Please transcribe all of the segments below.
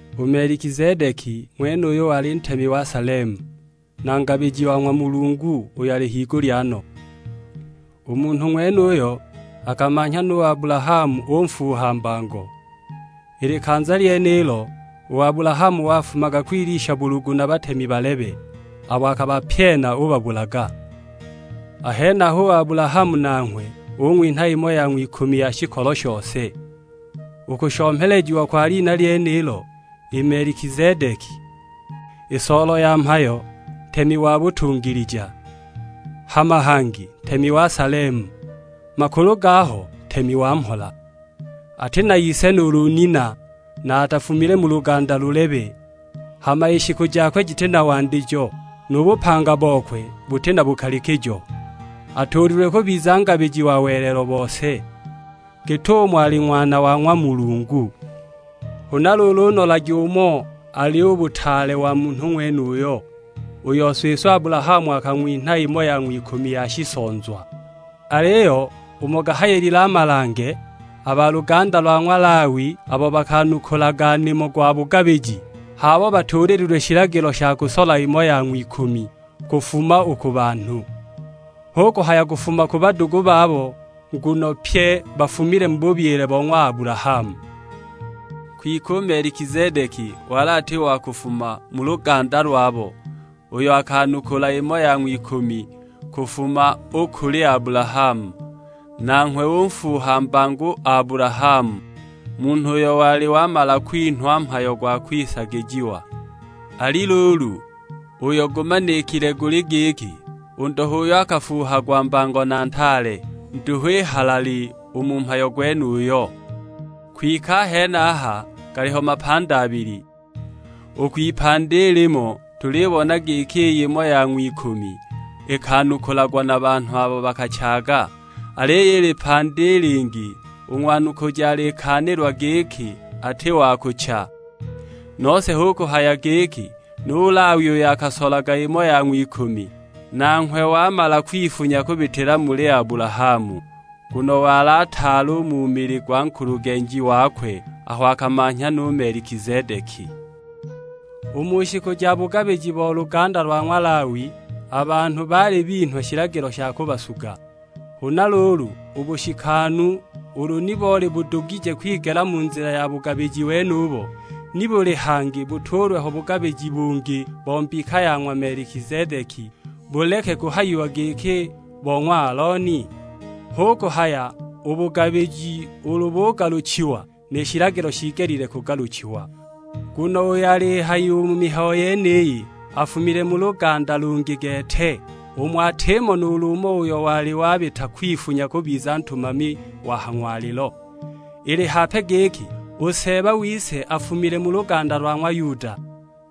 U Melikizedeki ng'wenuyu wali Ntemi wa Salemu, na Ngabiji wa ng'wa Mulungu uyo ali higulya no. U munhu ng'wenuyo, akamanhya nu Abulahamu unfuuha mbango. I likanza lyenilo, u Abulahamu wafumaga kwilwisha bulugu na batemi balebe, abo akabapyena ubabulaga. A henaho u Abulahamu nanghwe ung'winha imo ya ng'wikumi ya shikolo shose; u kushomelejiwa kwa lina lyenilo i 'Melikizedeki', i soolo ya mhayo, Ntemi wa butungilija, hama hangi Ntemi wa Salemu, makulu gaho Ntemi wa Mhola. Ati na ise nuulu nina, na atafumile mu luganda lulebe, hama i shiku jakwe jiti na wandijo, nu bupanga bokwe buti na bukalikijo. Atuulilwe kubiza Ngabiji wa welelo bose, git'umo ali Ng'wana wa ng'wa Mulungu. Huna luulu nolagi umo ali u butaale u munhu ng'wenuyo, uyo siswe Abulahamu akang'winha imo ya ng'wikumi ya shisonzwa. Aliyo umo gahayilile a malange, a ba luganda lwa ng'wa Lawi abo bakanukulaga nimo gwa bugabiji, h'abo batuulililwe shilagilo sha kusola imo ya ng'wikumi kufuma u ku banhu. Hu kuhaya kufuma ku badugu babo, nguno pye bafumile mu bubyile bo ng'wa Abulahamu. Kwike u Melikizedeki wali ati wa kufuma mu luganda lwabo, uyo akanukula imo ya ng'wikumi kufuma u kuli Abulahamu; nanghwe unfuuha mbango u Abulahamu, munhu uyo wali wamala kwinhwa mhayo gwa kwisagijiwa. Ali luulu, uyo gumanikile guli giki, u ndo h'uyo akafuuhagwa mbango na ntaale; nduhu i halali u mu mhayo gwenuyo. Kwike a henaha galiho mapandi abili, u kwipandi i limo tulibona giki iy'imo ya ng'wikumi ikanukulagwa na banhu abo bakachaaga. Aliyo i lipandi i lingi, u ng'wanukuji alikaanilwa giki ati wa kucha. Nose hu kuhaya giki, nu Lawi uyo akasolaga imo ya ng'wikumi, nanghwe wamala kwifunya kubitila muli Abulahamu. Nguno wali ataali u mu mili gwa nkulugenji wakwe, aho akamanhya nu Melikizedeki. U mu shiku ja bugabiji bo luganda lwa ng'wa Lawi, a banhu baali binhwa shilagilo sha kubasuga. Huna luulu u bushikanu ulu ni boli budugije kwigela mu nzila ya bugabiji wenubo, nibuli hangi butuulwe ho bugabiji bungi bo mbika ya ng'wa Melikizedeki, buleke kuhayiwa giki bo ng'wa Alooni? Hu kuhaya u bugabiji ulu bugaluchiwa, ni shilagilo shiigelile kugaluchiwa. Nguno uyo alihayiwa u mu mihayo yeniyi afumile mu luganda lungi gete, umo atimo nuulu umo uyo wali wabita kwifunya kubiza ntumami wa ha ng'walilo. Ili hape giki u Seeba wise afumile mu luganda lwa ng'wa Yuda;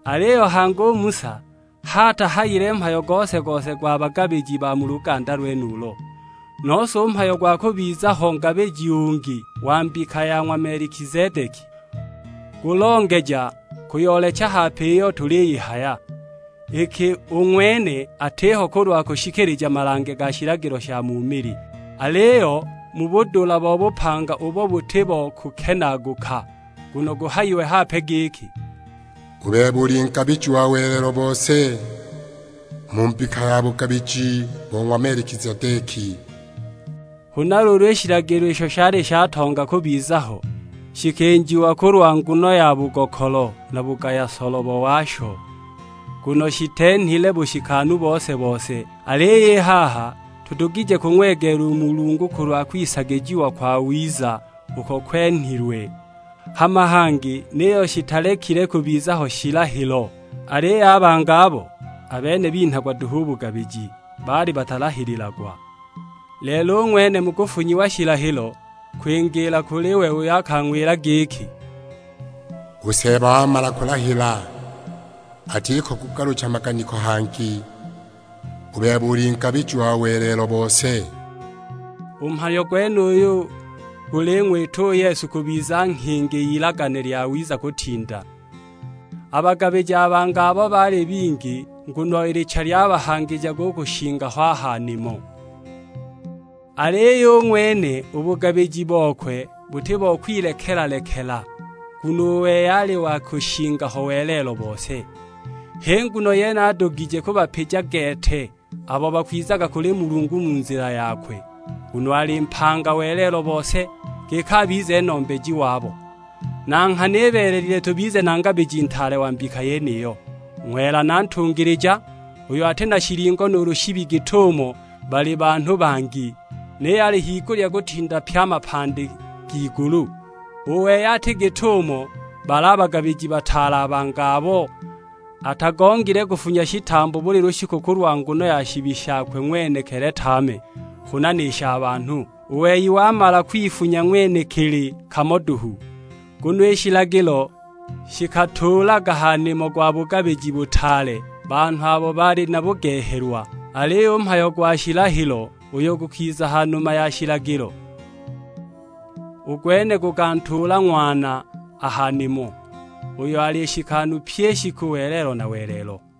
aliyo hangi u Musa h'atahayile mhayo gose-gose gwa bagabiji ba mu luganda lwenulo. Nose u mhayo gwa kubiza ho ngabiji ungi wa mbika ya ng'wa Melikizedeki, gulongeja kuyoolecha hape iyo tuliyihaya. Iki u ng'wene atiho kulwa kushikilija malange ga shilagilo sha mu mili, aliyo mu budula bo bupanga ubo buti bo kukenaaguka. Nguno guhayiwe hape giki, "U bebe uli Ngabiji wa welelo bose, mu mbika ya bugabiji bo ng'wa Melikizedeki." Huna luulu i shilagilo isho shali shatonga u kubiza ho, shikinjiwa kulwa nguno ya bugokolo na bugaya solobo washo. Nguno shitenhile bushikanu bose-bose. Aliyo i haha tudugije kung'wegeela u Mulungu kulwa kwisagijiwa kwawiza uko kwenhilwe. Hama hangi niyo shitalekile kubiza ho shilahilo, aliyo a bangi abo, a bene binhagwa duhu u bugabiji; baali batalahililagwa. Lelo u ng'wene mu kufunyiwa shilahilo, kwingiila kuli we uyo akang'wila giki, "U Seeba wamala kulahila, atiko kugalucha maganiko hangi, 'U bebe uli Ngabiji wa welelo bose.' " U mhayo gwenuyu guling'wita u Yesu kubiza nghingi y'ilagane lyawiza kutinda. A bagabiji a bangi abo baali bingi, nguno i licha lyabahangijaga u kushinga ho a ha nimo. Aliyo u ng'wene, u bugabiji bokwe buti bo kwilekela-lekela, nguno u wei ali wa kushinga ho welelo bose. H'i nguno yene adugije kubapija gete abo bakwizaga kuli Mulungu mu nzila yakwe, nguno ali mpanga welelo bose, giki abize Nombeji wabo. Na nghana ibeelelile tubize na Ngabiji Ntaale wa mbika yeniyo, Ng'wela na Ntungilija; uyo ati na shilingo nuulu shibi git'umo bali banhu bangi, niyo ali higulya kutinda pye a mapandi g'igulu. U wei ati git'umo bali a bagabiji bataale a bangi abo; atagongile kufunya shitambo buli lushiku kulwa nguno ya shibi shakwe ng'wenekili tame, huna ni sha banhu; u wei wamala kwifunya ng'wenekili kamo duhu. Nguno i shilagilo shikatuulaga ha nimo gwa bugabiji butaale banhu abo bali na bugehelwa, aliyo u mhayo gwa shilahilo, uyo gukiza ha numa ya shilagilo, u gwene gukantuula Ng'wana a ha nimo, uyo ali nshikanu pyi i shiku welelo na welelo.